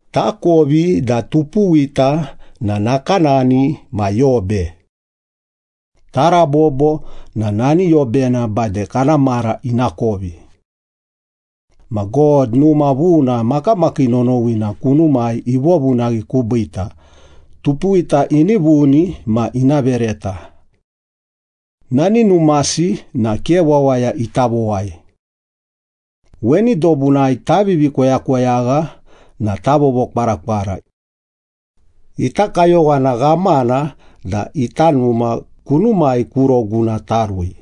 Takovi da tupuwita na nakanani ma yobe. Tarabobo na nani yobena bade kana mara ina kovi. Ma God numa vuna makamakii nonowina kunumai ivovunaghi kubiita, tupuwita ini vuni ma ina vereta. Nani numasi na ke wawaya ita vowai. Weni dobunai tavivi koyakoyagha na tavovokwarakwara. Ita kayowana ghamana da ita numa kunumai ku roguna tarui,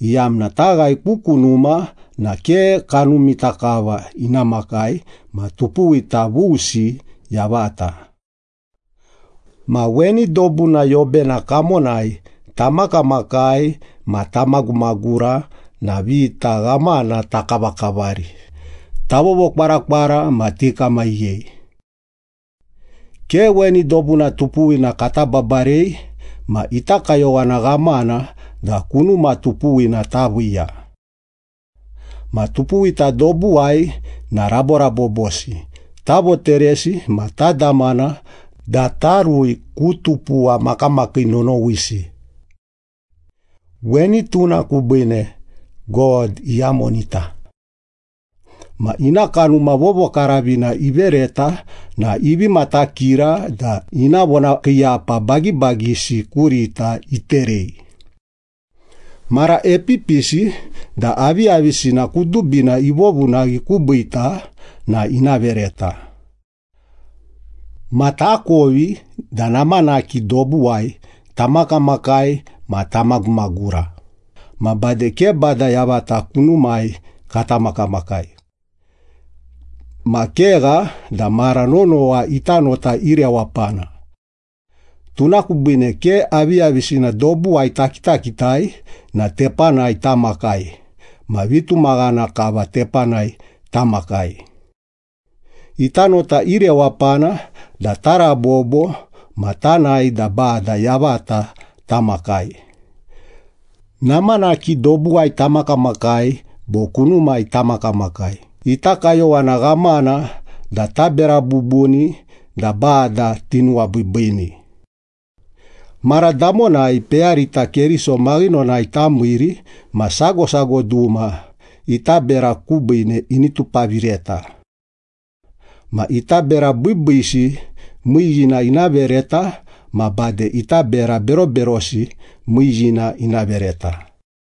iyamna taghae ku kunuma na ke kanumita kava ina makai ma tupuwita vusi yavata. Ma weni dobuna yobena kamonai tamakamakai ma tamagumagura na vita ghamana takavakavari, tavovokwarakwara ma tikamaghiyei. Ke weni dobuna tupuwina kata babarei, ma ita kayowana ghamana da kunuma tupuwina taviiya. Ma tupuwita dobuwai na raborabobosi, tavoteresi ma tadamana da tarui ku tupuwa makamakii nonowisi. Weni tuna kubiine God iyamonita. Ma ina Kanuma Vovokaravina ivereta na ivi matakira da ina vonakiiyapa bagibagisi kurita iterei. Mara epipisi da aviyavisina kudubina ivovunaghi kubiita na ina vereta. Ma takovi da namanaki dobuwai tamakamakai ma tamagumagura ma bade ke Bada yavata kunumai kata makamakai. Ma kegha da mara nonowa ita nota irewapana. Tuna kubiine ke aviyavisina dobuwai takitakitai na tepanai tamakai ma vitumaghana kava tepanai tamakai. Ita nota irewapana da tarabobo ma tanae da Bada yavata tamakai. Namanaki dobuwai tamakamakai bo kunumai tamakamakai, ita kayowana ghamana da tabera bubuni da Bada tinuwabiibiini. Mara damonai peyarita Keriso maghinonai tamiiri ma sago sago duma ita bera kubiine ini tupavireta. Ma ita bera biibiisi miiyiina ina vereta ma bade ita bera beroberosi miiyiina ina vereta.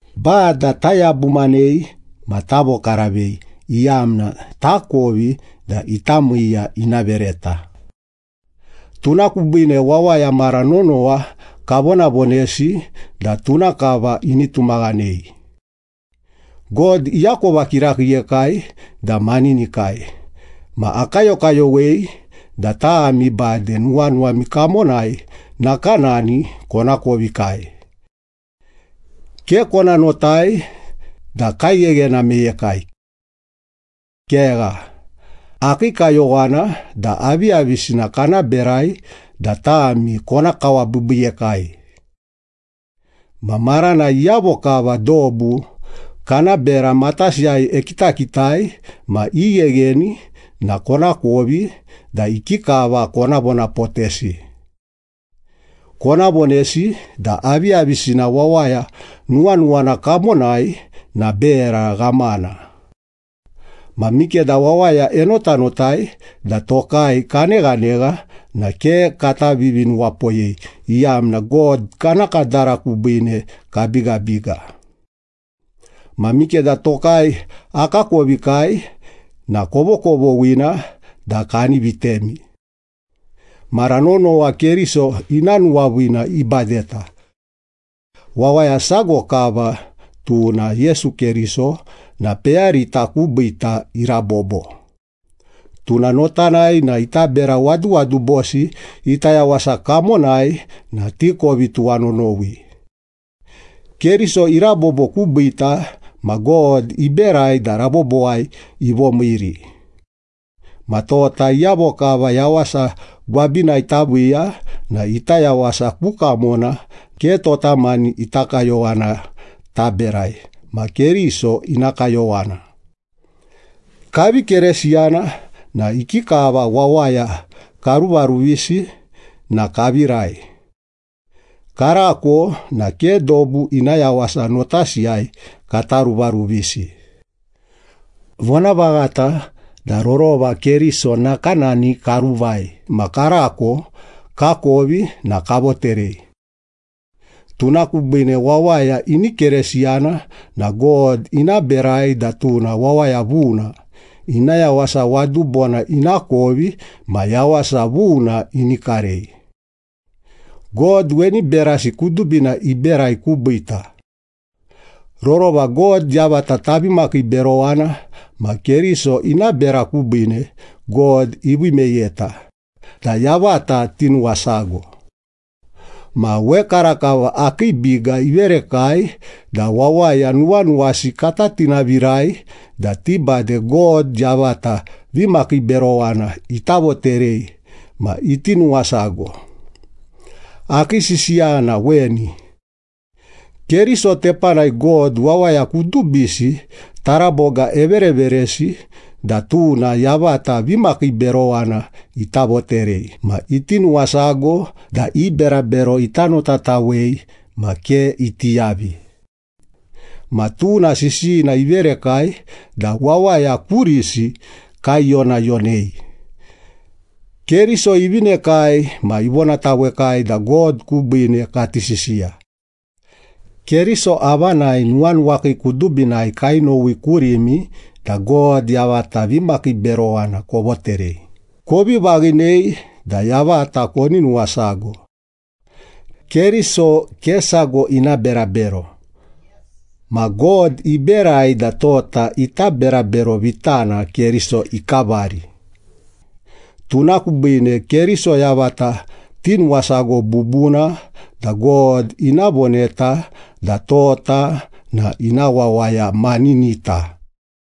Bada tayabumanei ma tavokaravei iyamna takovi da ita miiya ina vereta. Tuna kubiine wawaya mara nonowa kavonavonesi da tuna kava ini tumaghanei. God iakova kirakiiyekai da maninikai ma akayokayowei da tami bade nuwanuwami kamonai nakanani konakovikai. Ke kona notai da kaigheghena meyekai. Kegha, akii kayowana da aviyavisina kana berai da tami kona kawabiibiiyekai. Ma maranai iyavo kava dobu kana bera matasiyai ekitakitai ma ighegheni na konakovi da ikikava kona vonapotesi. Kona vonesi da aviyavisina wawaya nuwanuwana kamonai na bera ghamana. Ma mikeda wawaya enotanotai da tokai kaneghanegha na ke kata vivinuwapoyei, iyamna God kana kadara kubiine kabigabiga. Ma mikeda tokai akakovikai na kovokovoghina da kani vitemi. Mara nonowa Keriso ina nuwaviina ibadeta. Wawaya sago kava, tuna Yesu Keriso na peyarita kubiita irabobo. Tuna notanai na ita bera waduwadubosi ita yawasa kamonai na tikovi tuwanonowi. Keriso irabobo kubiita ma God iberai da rabobowai ivomiiri. Ma tota iyavo kava yawasa gwabinai taviiya na ita yawasa ku kamona ke tota mani ita kayowana taberai ma Keriso ina kayowana. Kavi Keresiyana na ikikava wawaya karuvaruvisi na kavirai. Karako na ke dobu ina yawasa notasiyai kata ruvaruvisi. Vonavaghata da rorova Keriso nakanani karuvai ma karako kakovi na kavoterei. Tuna kubiine wawaya ini Keresiyana na God ina berai da tuna wawaya vuna, ina yawasa wadubona ina kovi ma yawasa vuna ini karei. God weni berasi kudubina iberai kubiita. Rorova God yavata tavi makiiberowana, ma Keriso ina bera kubiine, God ivii meyeta da yavata tinuwasago. Ma wekarakava akii biga iverekai da wawaya nuwanuwasi kata tinavirai da ti bade God yavata vimakiiberowana ita voterei ma iti nuwasago. Akii sisiya na weni. Keriso tepanai God wawaya kudubisi taraboga evereveresi da tuna yavata vimakiiberowana ita voterei ma iti nuwasago da i berabero ita notatawei ma ke iti yavi. Ma tuna sisiyina iverekai da wawaya kurisi kaiyonayonei. Keriso ivinekai ma ivonatawekai da God kubiine kati sisiya. Keriso avanai nuwanuwakii kudubinai kainowi kurimi da God yavata vimakiiberowana kovoterei, kovi vaghinei da yavata koni nuwasago. Keriso ke sago ina berabero. Ma God iberai da tota ita berabero vitana Keriso ikavari. Tuna kubiine Keriso yavata tinuwasago bubuna da God ina voneta da tota na ina wawaya maninita.